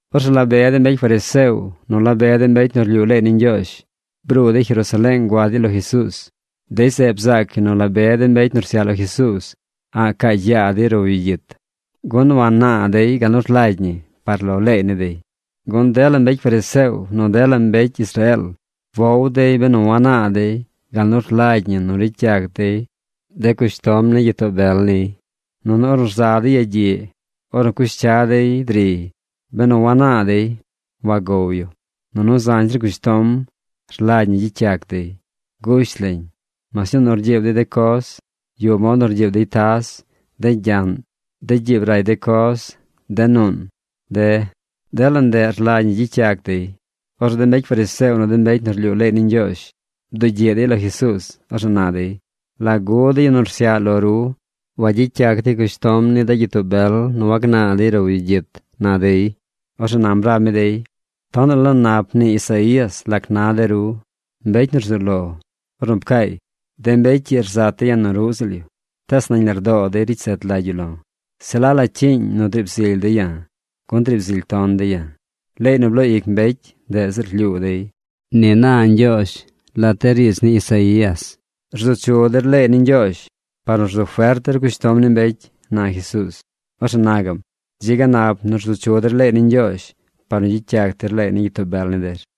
Orzeꞌ la be de mbecy fariseo nu la be de mbecy nu rlyuu leey ni Ñgyoozh bruu dey Jerusaleeng gua dey lo Jesuuz. Dey zeꞌ bzaac yu nu la be de mbecy nu rsyaꞌ lo Jesuuz a̱ꞌ caacy yaa dey row yu gyit, gun wannaa dey gal nu rlagy ñi par lo leey ni dey. Gun dela mbecy fariseo nu dela mbecy Israeel wow dey benu wanaa dey gal nu rlagy ñi nu ricy yac dey de cushtom ni gyitoo bel niy. Nunu ornu rza dey yagyiꞌ, ornu cush cya dey driy, benu wanaa dey, wagow yu. Nunu zañ zir cushtom rlagy ñi gyicy yac dey. Gush lañ: mas ñuu nu rgyiib dey de coz. Yuꞌ mod nu rgyiib dey taz, de gyaꞌn, de gyiib nu ray de coz, de nuun, de. Dela ndeꞌ rlagy ñi gyicy yac dey. Orzeꞌ de mbecy fariseo nu de mbecy nu rlyuu leey ni Ñgyoozh bdugyiꞌ dey lo Jesuuz. Orzeꞌ na dey: ―¿Lagu de yu nu rsyaꞌ lo ru wagyicy yac dey cushtom ni de gyitoo bel nu wagnaa dey row yu gyit? ―na dey. Orzeꞌ nam rab mi dey: ―Tonaꞌ la nap mnii Isaías lac na de ru, mbecy nu rzuu lo, ornu pcaay: De mbecy ii rzat dey ya̱ nu ruꞌ ziꞌl yu, tees nañ lardoo dey ricy zet lagy yu lo̱. Se la la cyiiñ nu driib zily dey ya̱, gun driib zily ton dey ya̱. Leey nu bloo ic mbecy, ndeꞌ ziꞌl rlyuu dey. Ni na Ñgyoozh lat de riidz ni Isaías. Rzu chu der leey ni Ñgyoozh par nu rzu fert der cushtom ni mbecy ―na Jesuuz. Orzeꞌ na gaꞌm: ―Dzi ga nap nu rzu chu der leey ni Ñgyoozh par nu gyicy yac der leey ni gyitoo bel ni der,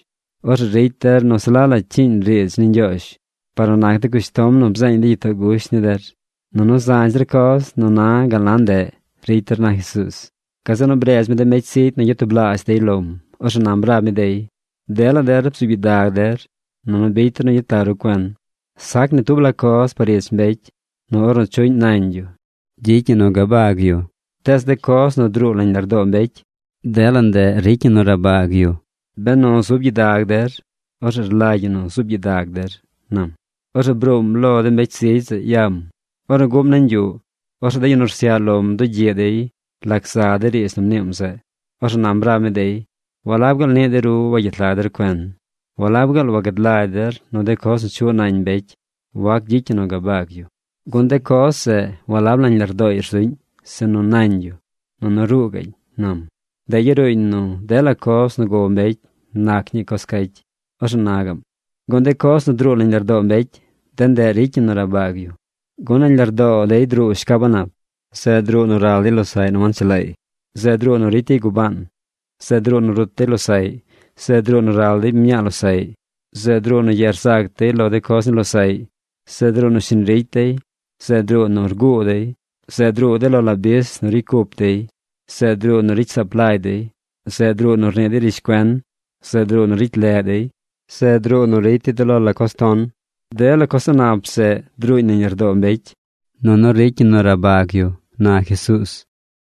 Orzeꞌ ricy der nu se la la cyiiñ riidz ni Ñgyoozh par nu nac de cushtom nu bzeeñ de gyitoo gush ni der. Nunu zañ zir coz nu na gal na ndeꞌ ricy der ―na Jesuuz. Gazeꞌ nu bredz mi de mbecy zigy nu gyatublaazh dey lom. Orzeꞌ nam rab mi dey: ―Dela der bzuub gyidag der nunu bicy der nu gyet lag ru cuen. Sac ni tub la coz par ich mbecy nu ornu chuꞌñ nañ yu gyicy ñi nu gabag yu. Tees de coz nu druu nañ lardoo mbecy, dela ndeꞌ ricy ñi nu rabag yu. Benu zub gyidag der, orzeꞌ rlagy ñi nu zuub gyidag der ―nam. Orzeꞌ bruum lo de mbecy zigy zeꞌ yam. Ornu guꞌm nañ yuꞌ, orzeꞌ de yu nu rsyaꞌ lom bdugyiꞌ dey lac za de riidz nu mniim zeꞌ. Orzeꞌ nam rab mi dey: ―¿Walab gaal niꞌ de ru wagyet lag der cuen? ¿Walab gaal wagad lagy der nu coz nu chuꞌ nañ mbecy wac gyicy ñi nu gabag yu? Gun de coz zeꞌ walab nañ lardooy rzuꞌñ, sinu nañ yu, nunu ruu gaꞌñ ―nam. Ndeꞌ yaruuñ nu dela coz nu gow mbecy nac ñii coz cacy. Orzeꞌ na gaꞌm: ―Gun de coz nu druu nañ lardoo mbecy, de ndeꞌ ricy ñi nu rabag yu. Gun nañ lardoo dey druu shcab a̱ꞌ nap. Zeꞌ druu nu ral dey losaꞌy nu wanchelaay. Zeꞌ druu nu ricy dey gubaan. Zeꞌ druu nu rut dey losaꞌy. Zeꞌ druu nu ral dey mñaa losaꞌy. Zeꞌ druu nu ye rzac dey lo coz ni losaꞌy. Zeꞌ druu nu shiñ ricy dey. Zeꞌ druu nu rguu dey. Zeꞌ druu de lo la bis nu ricy cup dey. Zeꞌ druu nu ricy saap lagy dey. Zeꞌ druu nu rnii dey rishcuen. Zeꞌ druu nu ricy leꞌ dey. Zeꞌ druu nu ricy dey de lo la coz ton. Dela coz a̱ꞌ nap zeꞌ druuñ nañ lardoo mbecy, nunu ricy ñi nu rabag yu ―na Jesuuz.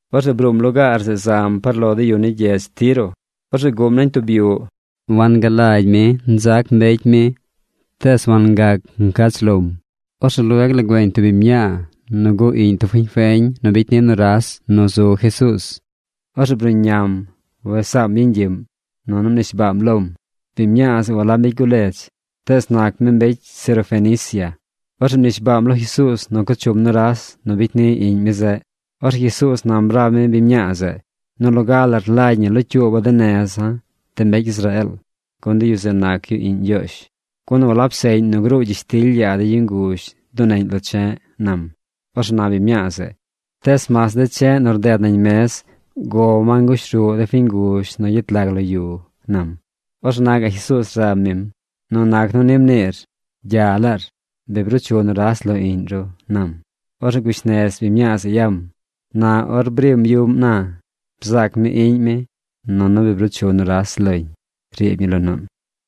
Orzeꞌ bruum lugaar zeꞌ zam par lo de yu ni gyedz Tiro. Orzeꞌ guꞌm nañ tub yuꞌ. Wangalagy mi nzac mbecy mi tees wangac ngach lom. Orzeꞌ lueg la güeñ tub biñ mñaa nu gu iꞌñ tub fiñ feñ nu bicy ni nuras nu zu Jesuuz. Orzeꞌ bruꞌñam wes saam yeñ gyiꞌm, nunu mnishbaam lom. Biñ mñaa zeꞌ walab mbecy guledz tees nac mi mbecy sirofenicia. Orzeꞌ mnishbaam lo Jesuuz nu co chum nuras nu bicy ni iꞌñ mi zeꞌ. Orzeꞌ Jesuuz nam rab mi biñ mñaa zeꞌ: ―Nu loga la rlagy ñi locyuuba̱ de neza̱, de mbecy Israeel. Gun de yu zeꞌ nac yu iꞌñ Ñgyoozh. Gun walab seꞌñ nu gruu gyishtily yaa de yu nguzh duneꞌñ lo che̱ꞌ ―nam. Orzeꞌ na biñ mñaa zeꞌ: ―Tees mas de che̱ꞌ nu rded nañ mez gow ma nguzh ruꞌ de fiñ nguzh nu gyet lag lo yu ―nam. Orzeꞌ na gaꞌ Jesuuz rab mim: ―Nu nac nu ni mniir, gya lar. Bi bruu chu nuras lo iꞌñ ru ―nam. Orzeꞌ gush nez biñ mñaa zeꞌ yam. Na or brim yuꞌm na, bzaac mi iꞌñ mi, nunu bi bruu chu nuras loñ riib ñi lo nuun.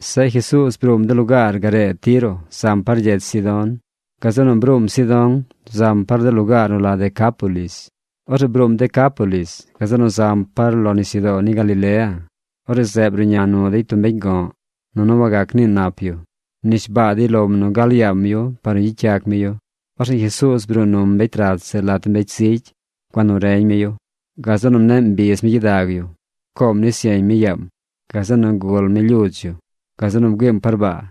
Zeꞌ Jesuuz bruum de lugaar garee Tiro zam par gyedz Sidón. Gazeꞌ nu bruum Sidón zam par de lugaar nu la Decápolis. Orzeꞌ bruum Decápolis. Gazeꞌ nu zam par lo nisyudoo ni Galilea. Orzeꞌ zeꞌ bruꞌña nu dey tub mbecy go̱ꞌ. Nunu wagac nii nap yu. Mnishbaa dey lom nu gal yaam yu par nu gyicy yac mi yu. Orzeꞌ Jesuuz bruu num mbecy rat zeꞌ lat de mbecy zigy. Gua nu reñ mi yu. Gazeꞌ nu mneꞌ mbiz mi gyidag yu. Pcoom nis yeñ mi yaam. Gazeꞌ nu gul mi lyudz yu. Gazeꞌ nu bgüiim par baa.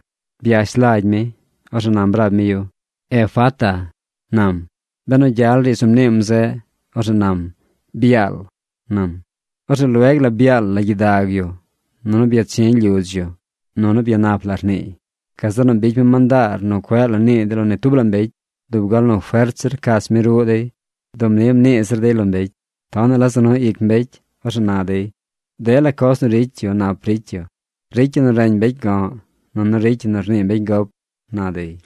Byash lagy mi. Orzeꞌ nam rab mi yu: ―¡Efata! ―nam. Benu gyal riidz nu mniim zeꞌ, orzeꞌ nam: ¡Byaal!, nam. Orzeꞌ lueg la byaal la gyidag yu nunu byachi̱ lyudz yu. Nunu byanap la rniiy. Gazeꞌ nu bicy mi mandaar nu cueꞌ la nii dey lo ni tub la mbecy. Dub gal nu fert zir rcach mi ruꞌ dey dub ni mnii zir dey lo mbecy. Tonaꞌ la za nu ic mbecy. Orzeꞌ na dey: ―Dela coz nu ricy yu nap ricy yu. ¡Ricy yu nu reñ mbecy go̱ꞌ nunu ricy yu nu rnii mbecy gop! ―na dey.